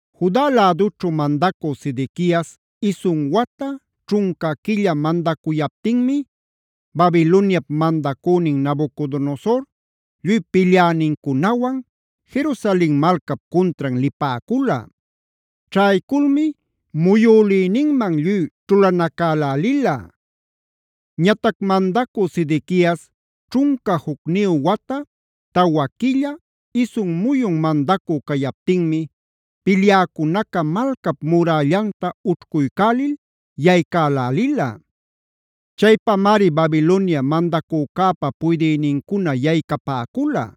Juda lädućhu mandacü Sedequias isun wata, ćhunca quilla mandacuyaptinmi Babiloniap mandacünin Nabucodonosor lluy pilyänincunawan Jerusalen malcap cuntran lipäcula. Ćhayculmi muyülïninman lluy ćhulanacälälila. Ñatac mandacü Sedequias ćhunca jucniyu wata, tawa quilla, isun muyun mandacü cayaptinmi pilyäcunaca malcap murällanta ućhcuycälil yaycälälila. Chaypamari Babilonia mandacücäpa puydïnincuna yaycapäcula.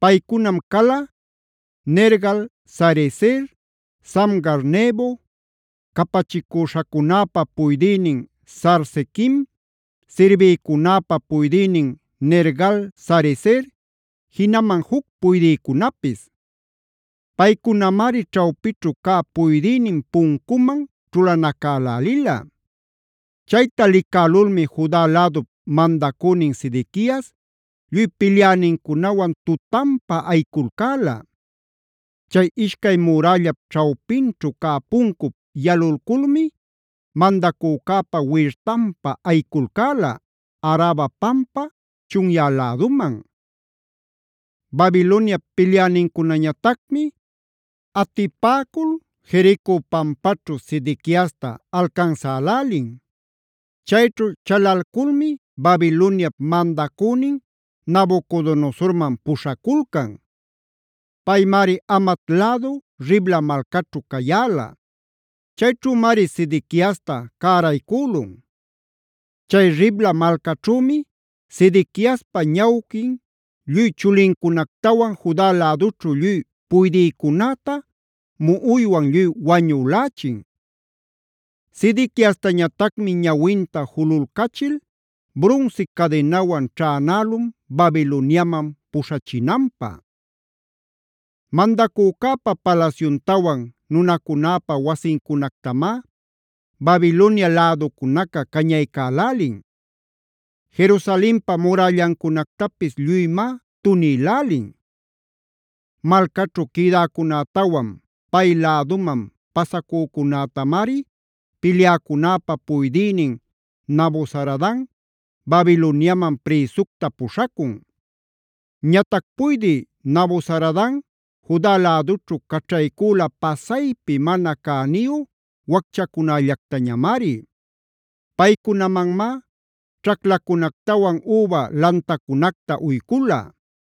Paycunam cala: Nergal-sarezer, Samgar-nebo, capachicüśhacunäpa puydïnin Sarsequim, sirbïcunäpa puydïnin Nergal-sarezer, jinaman juc puydïcunapis. Paycunamari ćhawpićhu cä puydïnin puncuman ćhulanacälälila. Chayta licälulmi Juda lädup mandacünin Sedequias lluy pilyänincunawan tutanpa ayiculcäla. Chay ishcay murällap ćhawpinćhu cä puncup yalulculmi mandacücäpa wirtanpa ayiculcäla, Araba pampa chunyä läduman. Babiloniap pilyänincunañatacmi atipäcul Jerico pampaćhu Sedequiasta alcansälälin. Chayćhu chalalculmi Babiloniap mandacünin Nabucodonosorman puśhaculcan. Paymari Hamat lädu Ribla malcaćhu cayäla. Chayćhümari Sedequiasta cäraycülun. Chay Ribla malcaćhümi Sedequiaspa ñawquin lluy chulincunactawan Juda lädućhu lluy puydïcunäta muꞌuywan lluy wañülächin. Sedequiastañatacmi ñawinta jululcachil brunsi cadinawan ćhänälun Babiloniaman puśhachinanpä. Mandacücäpa palasyuntawan nunacunäpa wasincunactamá Babilonia läducunaca cañaycälälin. Jerusalenpa murällancunactapis lluymá tunïlälin. Malcaćhu quïdäcunätawan pay läduman pasacücunätamari pilyäcunäpa puydïnin Nabuzaradan Babiloniaman prïsucta puśhacun. Ñatac puydï Nabuzaradan Juda lädućhu caćhaycüla pasaypi mana cäniyu wacchacunällactañamari. Paycunamanmá ćhaclacunactawan üba lantacunacta uycula.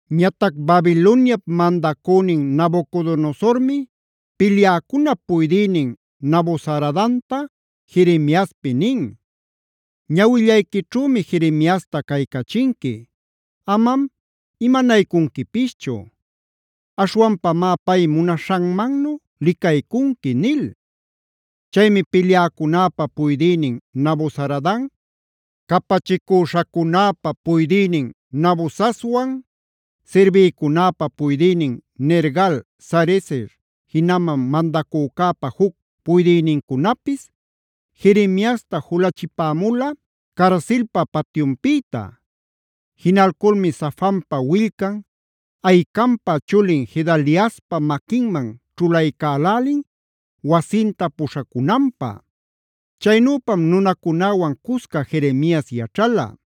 Ñatac Babiloniap mandacünin Nabucodonosormi pilyäcunap puydïnin Nabuzaradanta Jeremiaspi nin: “Ñawillayquićhümi Jeremiasta caycachinqui. Amam imanaycunquipischu. Aśhwanpamá pay munaśhanmannu licaycunqui” nil. Chaymi pilyäcunäpa puydïnin Nabuzaradan, capachicüśhacunäpa puydïnin Nabusazban, sirbïcunäpa puydïnin Nergal-sarezer, jinaman mandacücäpa juc puydïnincunapis, Jeremiasta julachipämula carsilpa patyunpïta. Jinalculmi Safanpa willcan, Ahicampa chulin Gedaliaspa maquinman ćhulaycälälin wasinta puśhacunanpä. Chaynüpam nunacunäwan cusca Jeremias yaćhala.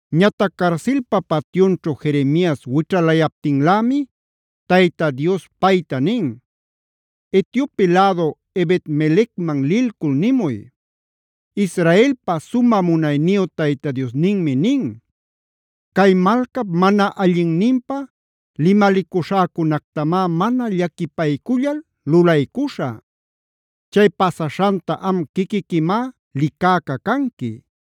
Ñatac carsilpa patyunćhu Jeremias wićhalayaptinlämi Tayta Dios payta nin: “Etiope lädu Ebed-melecman lilcul nimuy: ‘Israelpa sumä munayniyu Tayta Diosninmi nin: Cay malcap mana allinninpä limalicuśhäcunactamá mana llaquipaycullal lulaycuśhä. Chay pasaśhanta am quiquiquimá licäca canqui.